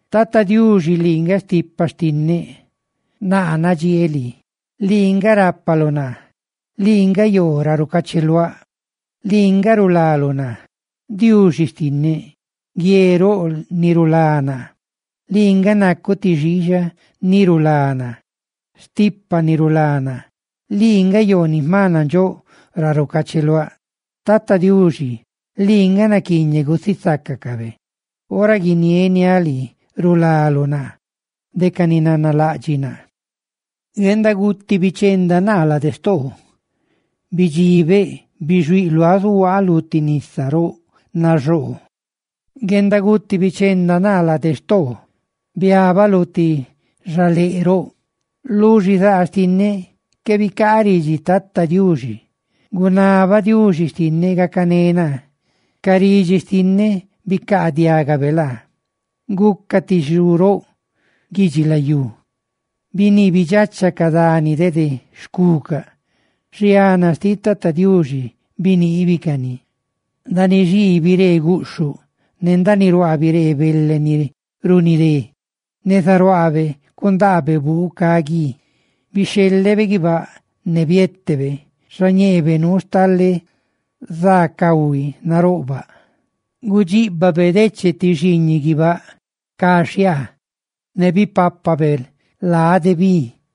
Tata Diuxi, lii nga stipa xtinneꞌ; ¡naa nadxieeꞌ lii! Lii nga rápaluꞌ naa, lii nga yoo ra rucacheluáꞌ, lii nga rulaluꞌ naa, Diuxi xtinneꞌ, guie roꞌ ni rulá naa, lii nga nacuꞌ ti xiixa ni rulá naa, stipa ni rulá naa, lii nga yoo ni jma nandxóꞌ ra rucacheluáꞌ. Tata Diuxi, lii nga naquiiñeꞌ gusisácacabe; ora guinieniáꞌ lii, rulaluꞌ naa de ca ni nanalaꞌdxiꞌ naa. Guendaguti bichenda naa lade xtoo; bidxibeꞌ, bixuíꞌ luáꞌ zuhuaa lu ti nisa roꞌ naxoo. Guendaguti bichenda naa lade xtoo; ¡biabaꞌ lu ti xaléꞌ roꞌ! Lu xizaa xtinneꞌ que bicaa ridxi Tata Diuxi, gunabaꞌ Diuxi xtinneꞌ gacané naa, ¡ca ridxi xtinneꞌ gabe laa! Guca ti xu roꞌ guidxilayú; biniibidxacha ca dani dede xcuca; xiana xtiꞌ Tata Diuxi biniibicani. Ndaaniꞌ xii biree guꞌxhuꞌ, ne ndaaniꞌ ruaa biree bele ni runidé; ¡neza ruaabe cundaabe buu ca guí! Bixhelebe guibáꞌ ne bietebe. ¡Xañeebe nuu stale za cahui naroꞌbaꞌ! Gudxiꞌbabe deche ti xiiñiꞌ guibáꞌ ca xhiaa, ne bipapabe lade bi.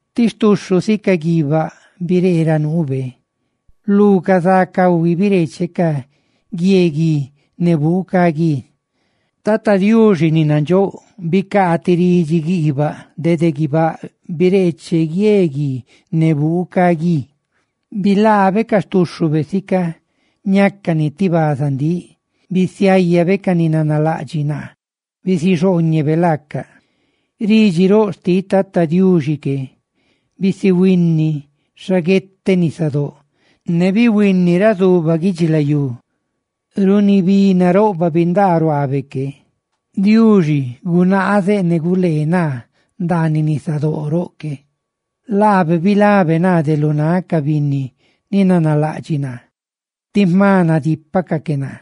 Ti xtuxhu sica gui guibáꞌ biree ra nuube; lu ca za cahui bireeche ca guie gui ne buu ca gui. Tata Diuxi ni nandxóꞌ bicaa ti ridxi guiibaꞌ dede guibáꞌ; bireeche guie gui ne buu ca gui. Bilaabe ca xtuxhube sica ñácani ti bazandíꞌ, bisiayabe ca ni nanalaꞌdxiꞌ naa bisixhooñebe laacaꞌ. Ridxi roꞌ xtiꞌ Tata Diuxi que, bisihuínini xaguete nisadóꞌ ne bihuini ra zuba guidxilayú runi bi naroꞌbaꞌ bindaa ruaabe que. Diuxi bisigaa náꞌ dede ra nasoo, ne nabe guleebe naa ndaaniꞌ nisadóꞌ roꞌ que. Laabe bilabe naa de lu náꞌ ca binni ni nanalaꞌdxiꞌ naa tí jma nadípacaꞌ que naa.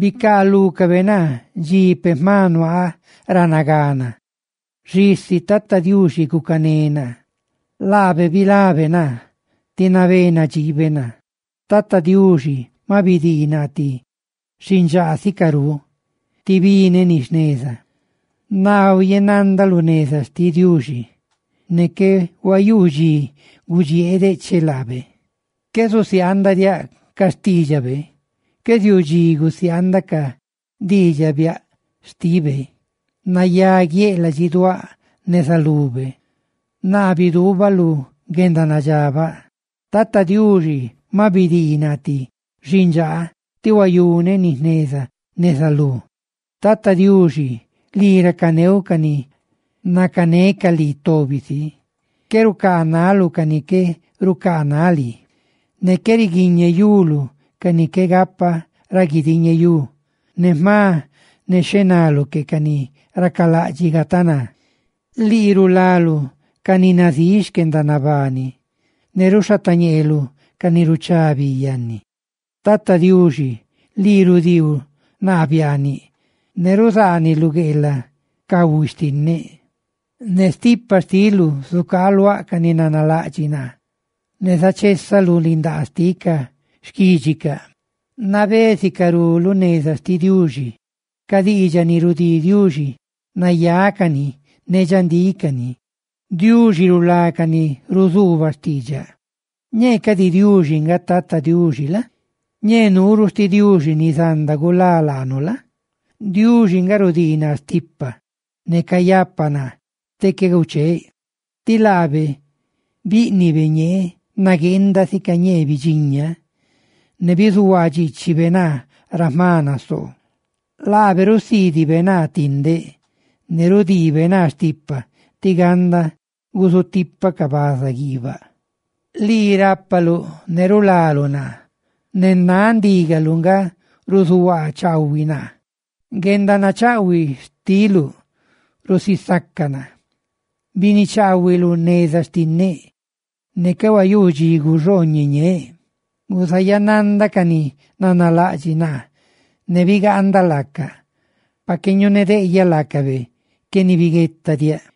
Bicaalúcabe naa dxi peꞌ jma nuaaꞌ ra nagana, xisi Tata Diuxi gucané naa; laabe bilabe naa; ¡tí nabé nadxiibe naa! Tata Diuxi maꞌ bidii naa ti xindxaa sicarú tí bineꞌ ni jneza, naa huayenandaꞌ lu xneza Diuxi; ¡ne qué huayuu diꞌ dxi gudxieeꞌ decheꞌ laabe! Qué zusiaandaꞌ diaꞌ ca xtiidxabe; ¡qué ziuu dxi gusiaandaꞌ ca diidxaꞌ biaꞌ xtibe! Nayaguiéꞌ ladxiduáꞌ neza lube; naa biduubaꞌ lu guendanadxabaꞌ. Tata Diuxi ma bidii naa ti xindxaa tí huayune ni jneza neza lú. Tata Diuxi, lii racaneuꞌ ca ni nacanecaꞌ lii tobi si, qué rucaanaluꞌ ca ni qué rucaanaꞌ lii, ne qué riguiñeyuluꞌ ca ni qué gapa ra guidiñeyú, ne jma nexhenaluꞌ que ca ni racalaꞌdxiꞌ gataná. Lii rulaluꞌ ca ni nazíꞌ xquendanabani, ne ruxhatañeeluꞌ ca ni ruchá bi yanni. Tata Diuxi, lii rudiiluꞌ naa biaaniꞌ; ne ruzaaniluꞌ gueelaꞌ cahui xtinneꞌ. Ne stipa xtiluꞌ zucaaluaꞌ ca ni nanalaꞌdxiꞌ naa, ne zachesaꞌ lu lindaa xtiꞌ xquídxicaꞌ. Nabé sicarú lu neza xtiꞌ Diuxi; ca diidxaꞌ ni rudii Diuxi, nayácani ne dxandícani; ¡Diuxi rulá ca ni ruzuubaꞌ xtiidxaꞌ! Ñee cadi Diuxi, nga Tata Diuxi la? Ñee nuuruꞌ xti Diuxi ni zanda gulá laanu la? Diuxi nga rudii naa stipa, ne cayapa naa tí qué gucheeꞌ, tí laabe bíꞌnibe ñeeꞌ nagueenda sica ñee bidxiñaꞌ, ne bizuhuaa dxiichibe naa ra jma nasoo. Laabe rusiidibe naa tindeꞌ, ne rudiibe naa stipa tí ganda gusutipaꞌ ca baza guiibaꞌ. Lii rápaluꞌ ne rulaluꞌ naa, ne náꞌ ndígaluꞌ nga ruzuhuaa chaahuiluꞌ naa; guendanachaꞌhuiꞌ xtiluꞌ rusisaca naa. Binichaahuiluꞌ neza xtinneꞌ, ne qué huayuu dxi guiree chuchi ñeeꞌ. Guzayananda ca ni nanalaꞌdxiꞌ naa ne bigaanda laacaꞌ, pa que ñunedeꞌyaꞌ laacabe, qué nibiguetadiaꞌ.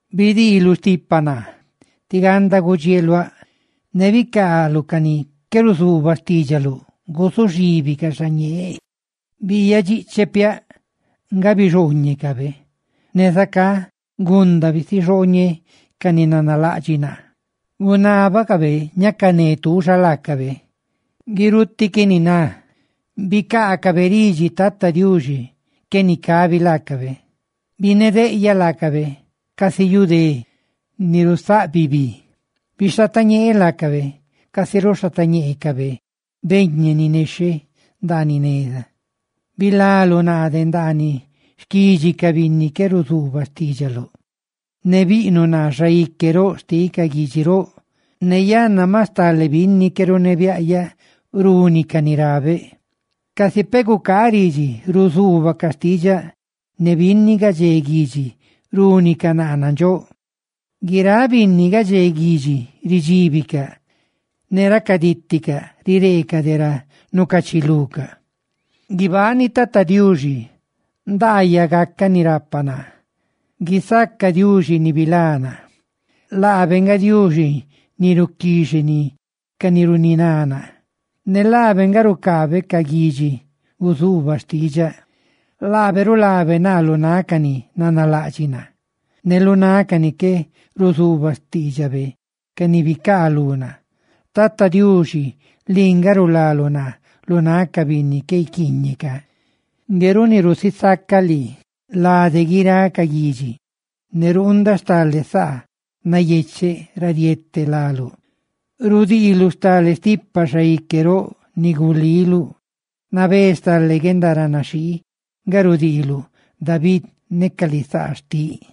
Bidiiluꞌ stipa naa tí ganda gudxieeluáꞌ; ne bicaaluꞌ ca ni qué ruzuubaꞌ xtiidxaluꞌ guzuxibicaꞌ xañeeꞌ, biiyadxiꞌcheꞌ piaꞌ nga bixooñecabe. Ne zacá gunda bisixooñéꞌ ca ni nanalaꞌdxiꞌ naa. Gunábacabe ñacané tuuxa laacabe, guirutiꞌ qué niná; bicaacabe ridxi Tata Diuxi, qué nicabi laacabe. ¡Binedeꞌyaꞌ laacabe casi yu dé ni rusaꞌbi bi! ¡Bixhatañeeꞌ laacabe, casi ruxhatañeecabe beñe ni nexhe ndaaniꞌ neza! Bilaluꞌ naa de ndaaniꞌ xquidxi ca binni qué ruzuubaꞌ xtiidxaluꞌ, ne biꞌnuꞌ naa xaique roꞌ xtiꞌ ca guidxi roꞌ, ne yanna ma stale binni qué runebiaꞌyaꞌ rúnicaꞌ ni rabeꞌ. Casi peꞌ gucaaꞌ ridxi, ruzuubacaꞌ xtiidxaꞌ; ne binni gadxé guidxi rúnicaꞌ naa nandxóꞌ, guiráꞌ binni gadxé guidxi ridxíbicaꞌ ne racadíticaꞌ rireecaꞌ de ra nucachilucaꞌ. ¡Guibani Tata Diuxi! ¡Nandaayaꞌ gacaꞌ ni rapa naa! ¡Guisaca Diuxi ni bilá naa! Laabe nga Diuxi ni ruquixeni ca ni runiná naa ne laabe nga rucaabe ca guidxi guzuubacaꞌ xtiidxaꞌ. Laabe rulabe naa lu náꞌ ca ni nanalaꞌdxiꞌ naa, ne lu náꞌ ca ni qué ruzuubaꞌ xtiidxabe ca ni bicaalú naa. ¡Tata Diuxi, lii nga rulaluꞌ naa lu náꞌ ca binni qué guiquiiñe ca! Ngue runi rusisacaꞌ lii lade guiráꞌ ca guidxi ne ruundaꞌ stale saa nayecheꞌ ra riete láluꞌ. Rudiiluꞌ stale stipa xaique roꞌ ni guliluꞌ; nabé stale guendaranaxhii nga rudiiluꞌ David ne ca lisaa xtiꞌ.